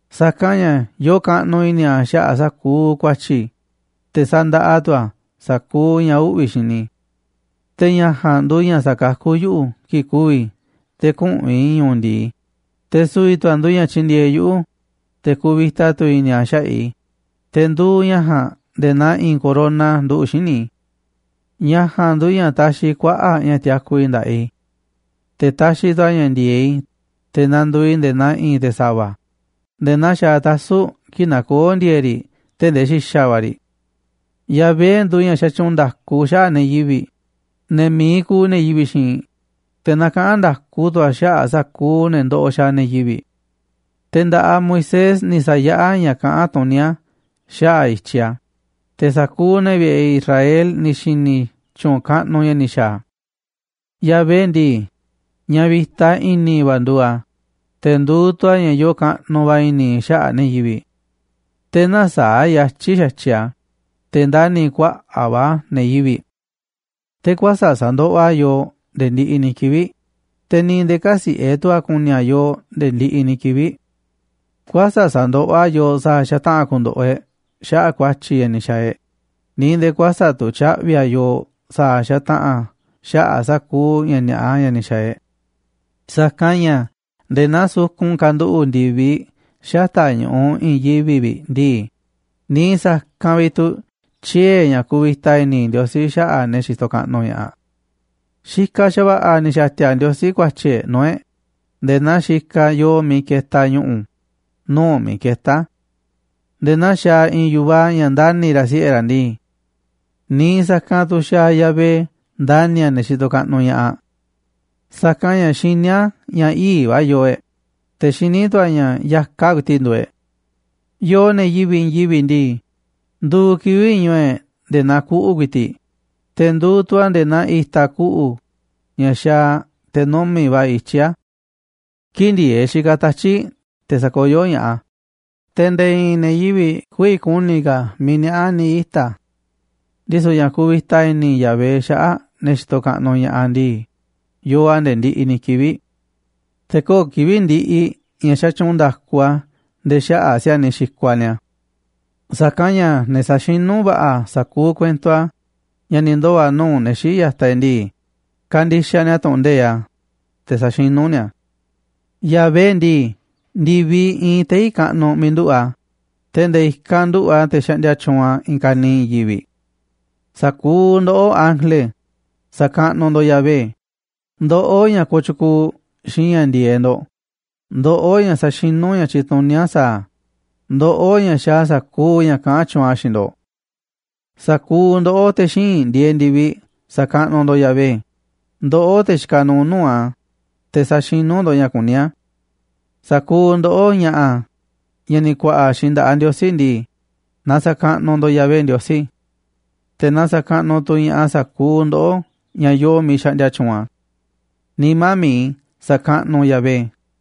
Sa̱kanꞌ ña̱ yoo kaꞌnuꞌ i̱ni̱ a̱ xaꞌa̱ꞌ sa̱kuuꞌ ku̱a̱tyi̱ i̱, te̱ sandaꞌa tu̱ a̱ sa̱kuuꞌ ña̱ uꞌvi̱ xini i̱. Te̱ ña̱ ja̱a̱nꞌ nduuꞌ ña̱ sakakú yuꞌu̱ kii̱ꞌ ku̱vi̱ i̱ te̱ küꞌu̱n i̱ ñu̱u̱ ndi̱i, te̱ su̱vi̱ tu̱ a̱ nduuꞌ ña̱ tyindieeꞌ yuꞌu̱, te̱ kuvita tu̱ i̱ni̱ a̱ xaꞌa̱ꞌ i̱, te̱ nduuꞌ ña̱ ja̱a̱nꞌ nde̱e̱ naa i̱i̱n corona nduꞌu̱ꞌ xíniꞌ i̱. Ña̱ ja̱a̱nꞌ nduuꞌ ña̱ taxiꞌ kuaꞌa̱ꞌ ña̱ tiaku i̱ nda̱ꞌaꞌ i̱, te̱ taxiꞌ tu̱ a̱ ña̱ ndi̱e̱eꞌ i̱ te̱ nanduuꞌ i̱ nde̱e̱ naa i̱i̱n te̱ sa̱va̱, nde̱e̱ naa xaaꞌ tasu̱ꞌ kii̱ꞌ nakoó ndi̱e̱e̱ꞌ riꞌ tee̱ꞌ ndee xi̱xa̱ va̱ riꞌ. Yahvé nduuꞌ ña̱ xatyuunꞌ nda̱ku xaꞌa̱ꞌ ne̱ yivi̱ꞌ, ne̱ mi̱iꞌ kuuꞌ ne̱ yivi̱ꞌ xiinꞌ, te̱ nakaꞌán nda̱ku tu̱ a̱ xaꞌa̱ꞌ sa̱kuuꞌ ne̱ ndoꞌoꞌ xaaꞌ ne̱ yivi̱ꞌ. Te̱ nda̱ꞌaꞌ Moisés ni̱ sa̱yaꞌá a̱ ña̱ kaꞌán tuní a̱ xaꞌa̱ꞌ i̱tyiꞌ a̱, te̱ sa̱kuuꞌ ne̱ vi̱ꞌe̱ Israel ni̱ xi̱ni̱ tyu̱u̱n kaꞌnuꞌ ña̱ ni̱ xa̱a̱ a̱. Yahvé ndii, ña̱ vi̱ta i̱ni̱ va̱ nduuꞌ a̱, te̱ nduuꞌ tu̱ a̱ ña̱ yoo kaꞌnuꞌ va̱ i̱ni̱ xaꞌa̱ꞌ ne̱ yivi̱ꞌ. Te̱ näsaáꞌ yatyi̱ xa̱tyiꞌ a̱, te̱ ndani̱ kuaꞌa̱ꞌ va̱ a̱ ne̱ yivi̱ꞌ. Te̱ kuäsa̱ꞌ sa̱ndoꞌoꞌ a̱ yooꞌ nde̱e̱ ndiꞌiꞌ ni̱ kivi̱ꞌ, te̱ ni̱ nde̱e̱ kä̱siꞌe̱ tu̱ a̱ ku̱ni̱ a̱ yooꞌ nde̱e̱ ndiꞌiꞌ ni̱ kivi̱ꞌ. Kuäsa̱ꞌ sa̱ndoꞌoꞌ a̱ yooꞌ sa̱a̱ xataꞌa̱n ku̱ndo̱ꞌo̱ e̱ꞌ xaꞌa̱ꞌ ku̱a̱tyi̱ ña̱ ni̱ xa̱a̱ e̱ꞌ, ni̱ nde̱e̱ kuäsa̱ꞌ tu̱ tya̱ꞌvi̱ a̱ yooꞌ sa̱a̱ xataꞌa̱n xaꞌa̱ꞌ sa̱kuuꞌ ña̱ ni̱a̱ꞌa ña̱ ni̱ xa̱a̱ e̱ꞌ. Sa̱kanꞌ ña̱ nde̱e̱ naa sukun kanduꞌu̱ꞌ ndi̱viꞌ xata̱ꞌ ñu̱ꞌuꞌ i̱i̱n yivi̱ꞌ vi̱ꞌ ndii, niiꞌ sa̱kanꞌ vi̱ꞌ tu̱ tyiee̱ ña̱ kuvita i̱ni̱ Ndiosí xaꞌa̱ꞌ ne̱ xitoꞌ kaꞌnuꞌ ña̱ꞌaꞌ. Xikaꞌ xa̱va̱ꞌa̱ ni̱ xa̱ti̱a̱ Ndiosí ku̱a̱tyi̱ e̱ꞌ nuu̱ꞌ e̱ꞌ, nde̱e̱ naa xikaꞌ yoo miiꞌ ketaꞌ ñu̱ꞌu̱ nuu̱ꞌ miiꞌ ketá a̱. Nde̱e̱ naa xaaꞌ i̱i̱n yu̱vaꞌ ña̱ ndani̱ ra̱ siꞌe̱ ra̱ ndii, niiꞌ sa̱kanꞌ tu̱ xaaꞌ Yahvé ndani̱ a̱ ne̱ xitoꞌ kaꞌnuꞌ ña̱ꞌaꞌ. Sa̱kanꞌ ña̱ xiní a̱ ña̱ ii̱ꞌ va̱ yoo e̱ꞌ, te̱ xiní tu̱ a̱ ña̱ ya̱kaꞌ ku̱i̱ti̱ꞌ nduuꞌ e̱ꞌ. Yooꞌ, ne̱ yivi̱ꞌ i̱i̱n yivi̱ꞌ ndii, nduuꞌ kivi̱ꞌ ñu̱u̱ e̱ꞌ nde̱e̱ naa kuꞌu̱ ku̱i̱ti̱ꞌ, te̱ nduuꞌ tu̱ a̱ nde̱e̱ naa i̱ta̱ kuꞌu̱ ña̱ xaaꞌ te̱ numi̱ꞌ va̱ ityí a̱. Kii̱ꞌ ndi̱e̱eꞌ xikaꞌ tatyi̱ꞌ te̱ sakoyó ña̱ꞌaꞌ a̱, te̱ nde̱e̱ i̱i̱n ne̱ yivi̱ꞌ kü̱vi̱ ku̱ni̱ ka̱ miiꞌ niaꞌá ni̱ ita̱ a̱. Ndisu̱ ña̱ kuvita i̱ni̱ Yahvé xaꞌa̱ꞌ ne̱ xitoꞌ kaꞌnuꞌ ña̱ꞌaꞌ ndii, yoo a̱ nde̱e̱ ndiꞌiꞌ ni̱ kivi̱ꞌ. Te̱ köo̱ꞌ kivi̱ꞌ ndiꞌiꞌ ña̱ xatyuunꞌ nda̱ku a̱ nde̱e̱ xaꞌa̱ꞌ si̱a̱niꞌ xikuaꞌ ni̱a̱. Sa̱kanꞌ ña̱ ne̱ saxinú va̱ꞌa̱ sa̱kuuꞌ kuento a̱ ña̱ ni̱ ndoo̱ nuu̱ꞌ ne̱ xii̱ꞌ ya̱taꞌ e̱ꞌ ndii, kandixaꞌ ni̱a̱ tu̱ꞌu̱n nde̱iꞌ a̱, te̱ saxinú ni̱a̱ a̱. Yahvé ndii, ndi̱viꞌ iinꞌ tei̱ kaꞌnuꞌ miiꞌ nduꞌu̱ꞌ a̱, te̱ nde̱e̱ i̱kanꞌ nduꞌu̱ꞌ a̱ te̱ xaꞌndia tyuunꞌ a̱ i̱i̱n ka̱niiꞌ i̱i̱n yivi̱ꞌ. Sa̱kuuꞌ ndoꞌó, ángele, sa̱kaꞌnuꞌ ndo̱ꞌ Yahvé, ndoꞌó, ña̱ kooꞌ tyukuuꞌ xiinꞌ ña̱ ndi̱e̱eꞌ ndo̱ꞌ, ndoꞌó, ña̱ saxinú ña̱ tyituní a̱ sa̱a̱ a̱, ndoꞌó, ña̱ xaaꞌ sa̱kuuꞌ ña̱ kaꞌán tyuunꞌ a̱ xiinꞌ ndo̱ꞌ. Sa̱kuuꞌ ndoꞌó, te̱ xíinꞌ ndieeꞌ ndi̱viꞌ, sa̱kaꞌnuꞌ ndo̱ꞌ Yahvé, ndoꞌó, te̱ xikaꞌ nuuꞌ nuu̱ꞌ a̱, te̱ saxinú ndo̱ꞌ ña̱ kuní a̱. Sa̱kuuꞌ ndoꞌó, ña̱ꞌa̱, ña̱ ni̱ ku̱a̱ꞌa̱ xiinꞌ nda̱ꞌaꞌ Ndiosí ndii, na sa̱kaꞌnuꞌ ndo̱ꞌ Yahvé Ndiosí, te̱ na sa̱kaꞌnuꞌ tu̱ ña̱ꞌaꞌ sa̱kuuꞌ ndoꞌó, ña̱ yoo miiꞌ xaꞌndia tyuunꞌ a̱. Nimá mi̱iꞌ i̱, sa̱kaꞌnuꞌ u̱nꞌ Yahvé.